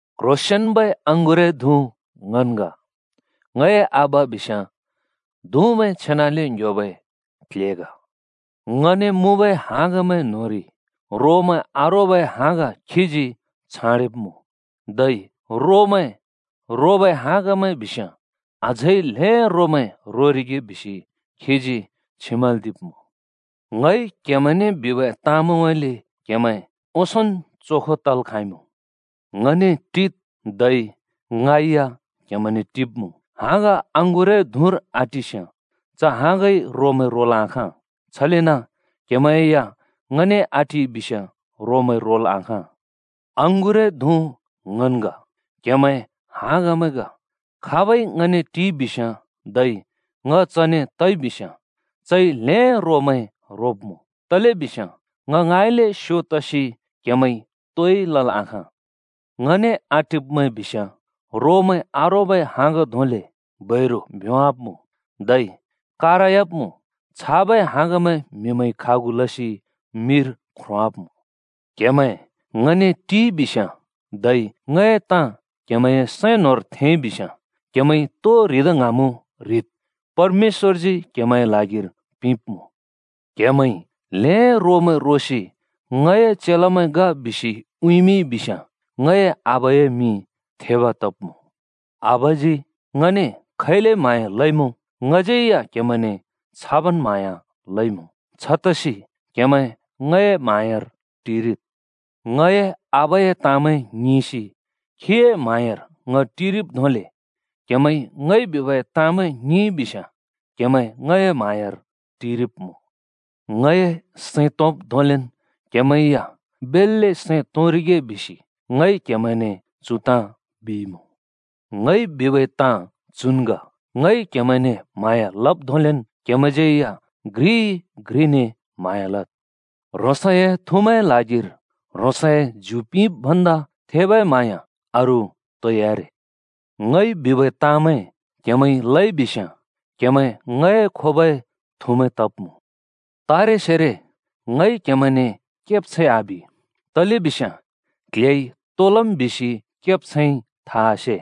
“क्ह्रोंसेंन्बै अँगुरए धुँ ङन् ग, ङए आबा बिस्याँ धुँमैं छेनाले ङ्‍ह्‍योबै क्ल्हे ग। ङने मुँबै हाँगमैं न्होंरि रोमैं आरोबै हाँग खीजी छाँडेब्मुँ। धै रोमैं रोबै हाँगमैं बिस्याँ अझै ल्हें रोमैं रोरिगे बिसि खीजी छिमल्दिब्मुँ। ङइ क्हेमैंने बिबै ताँमैंउँइँले क्हेमैं ओंसोंन् चोखो तल् खाँइमुँ। ङने टिद्, धै ङ या क्हेमैंने टिब्मुँ। हाँग अँगुरए धुँर आटिस्याँ च हाँगइ रोमैं रोल् आखाँ, छलेन क्हेमैं या ङने आटिइ बिस्याँ रोमैं रोल् आखाँ। “अँगुरए धुँ ङन् ग, क्‍हेमैं हाँगमैं ग। खाबै ङने टिइ बिस्याँ, धै ङ चने तइ बिस्याँ, चइ ल्हें रोमैं रोब्मुँ। तलेबिस्याँ ङ ङाँइँले स्यो तसि क्हेमैंइ तोइ लल् आखाँ। ङने आटिब्मैं बिस्याँ रोमैं आरोबै हाँग धोंले बैरु भ्योंवाब्मुँ, धै कारयाब्मुँ। छाबै हाँगमैं म्हिमैंइ खागु लसि मिर ख्रोंवाब्मुँ। क्‍हेमैं ङने टिइ बिस्याँ, धै ङए ताँ क्हेमैंए सैं न्होंर थेंइ बिस्याँ, क्हेमैंइ तो ह्रिदा ङ्हाँमुँ ह्रिद्, परमेश्‍वरजी क्हेमैंए ल्हागिर पिंब्मुँ। क्‍हेमैंइ ल्हें रोमैं रोसि ङए चेलामैं ग बिसि उँइँमिंइ बिस्याँ ङए आबाए मिं थेब तब्मुँ। “आबाजी ङने खैले म्‍हाँया लइमुँ, ङज्यै या क्हेमैंने छाबन् म्हाँया लइमुँ। छतसि क्हेमैं ङए म्हाँयार टिरिद्। ङए आबाए ताँमैं ङिंसि खीए म्हाँयार ङ टिरिब् धोंले क्हेमैंइ ङइ बिबै ताँमैं ङिंइ बिस्याँ क्हेमैं ङए म्हाँयार टिरिब्मुँ। ङए सैं तोंब् धोंलेन क्हेमैं या बेल्‍ले सैं तोंरिगे बिसि ङइ क्हेमैंने चु ताँ बिइमुँ। “ङइ बिबै ताँ चुन् ग, ङइ क्‍हेमैंने म्‍हाँया लब् धोंलेन् क्‍हेमैंज्यै या घ्रिइ-घ्रिने म्‍हाँया लद्। ह्रोंसए थुमैंए ल्हागिर ह्रोंसै ज्यु पिंब् भन्दा थेबै म्हाँया अरू तोइ आरे। ङइ बिबै ताँमैं क्हेमैंइ लइ बिस्याँ क्हेमैं ङए खोबै थुमैं तब्मुँ। तारेसेरो ङइ क्हेमैंने केब्छैं आबि, तलेबिस्याँ क्ल्हेइ तो लम् बिसि केब्छैंइ था आसे।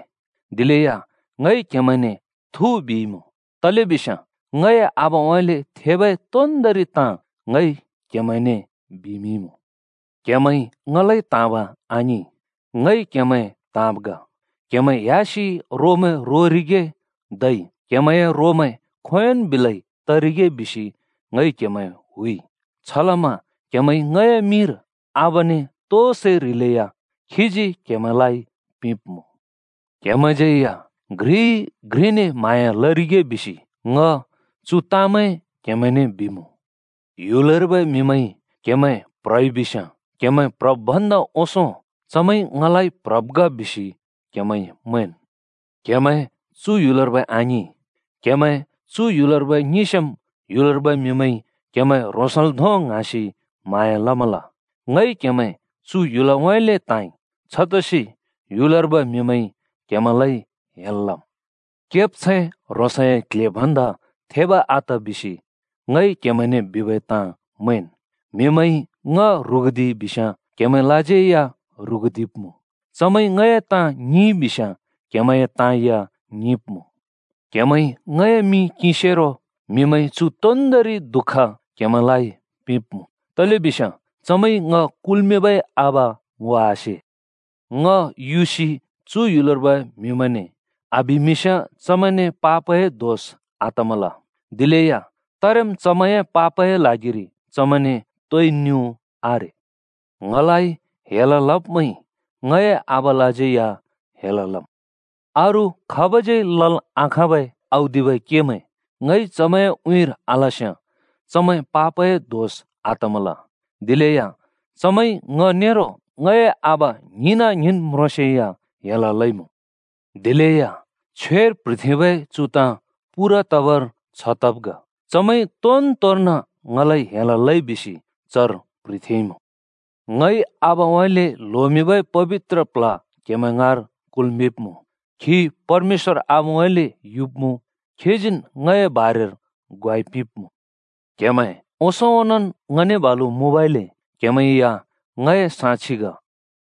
दिलेया ङइ क्हेमैंने थु बिइमुँ, तलेबिस्याँ ङए आबाउँइँले थेबै तोन्दोंरि ताँ ङइ क्हेमैंने बिमिंइँमुँ। क्‍हेमैंइ ङलाइ त्‍हाँब आङिं, ङइ क्हेमैं त्हाँब् ग। क्हेमैं ह्‍यासि रामैं रोरिगे धै क्हेमैंए रामैं खोंयोंन् बिलै तरिगे बिसि ङइ क्हेमैं हुइ। छलमा क्हेमैंइ ङए मिंर आबाने तो सै ह्रिलेया खीजी क्हेमैंलाइ पिंब्मुँ। क्हेमैंज्यै या घ्रिइ-घ्रिने म्हाँया लरिगे बिसि ङ चु ताँमैं क्हेमैंने बिमुँ। “ह्‍युलर्बै म्हिमैंइ क्‍हेमैं प्ह्रइ बिस्‍याँ, क्हेमैं प्ह्रब् भन्दा ओंसों चमैंइ ङलाइ प्ह्रब् ग बिसि क्हेमैंइ मैंन्। क्‍हेमैं चु ह्‍युलर्बै आङिं, क्हेमैं चु ह्‍युलर्बै ङिंस्याँम् ह्‍युलर्बै म्हिमैंइ क्हेमैं ह्रोंसल धों ङ्हाँसि म्हाँया लमल। ङइ क्हेमैं चु ह्‍युलउँइँले त्हाँइ। छतसि ह्‍युलर्बै म्हिमैंइ क्हेमैंलाइ हेल लम्। केब्छैं ह्रोंसए क्ल्हे भन्दा थेब् आत बिसि ङइ क्हेमैंने बिबै ताँ मैंन्। म्हिमैंइ ङ ह्रुगुदिइ बिस्याँ क्हेमैंलाज्यै या ह्रुगुदिब्मुँ। चमैंइ ङए ताँ ङिंइ बिस्याँ क्हेमैंए ताँ या ङिंब्मुँ। क्हेमैंइ ङए मिं किंसेरो म्हिमैंइ चु तोन्दोंरि दुःख क्हेमैंलाइ पिंब्मुँ। तलेबिस्याँ चमैंइ ङ कुल्मिंबै आबा ङो आसे। ङ युसि चु ह्‍युलर्बै म्हिमैंने आबिमिंस्याँ चमैंने पापए दोष आतमल। दिलेया तारेम् चमैंए पापए ल्हागिरि चमैंने तोइ न्युँ आरे। ङलाइ हेल लब्मैंइ ङए आबालाज्यै या हेल लम्। अरू खाबज्यै या लल् आखाँबै औदिबै केमैं ङइ चमैंए उँइँर आलस्याँ चमैं पापए दोष आतमल। दिलेया चमैंइ ङ नेरो ङए आबा ङ्हिंना-ङ्हिंन् म्रोंसेया हेल लइमुँ। दिलेया छ्वेर प्ह्रिथेंबै चु ताँ पूरा तबर छ तब् ग, ‘चमैंइ तोनतोर्न ङलाइ हेल लइ बिसि चर प्ह्रिथेंइमुँ।’ “ङइ आबाउँइँले ल्होमिंबै पबित्र प्ल्ह क्हेमैं ङाँर कुल्मिंब्मुँ, खी परमेश्‍वर आबाउँइँले युब्मुँ, खीजीन् ङए बारेर ग्वाइ पिंब्मुँ। क्हेमैं ओंसों ओंनोंन् ङने बालु मुँबइले क्हेमैं या ङए साक्षि ग।”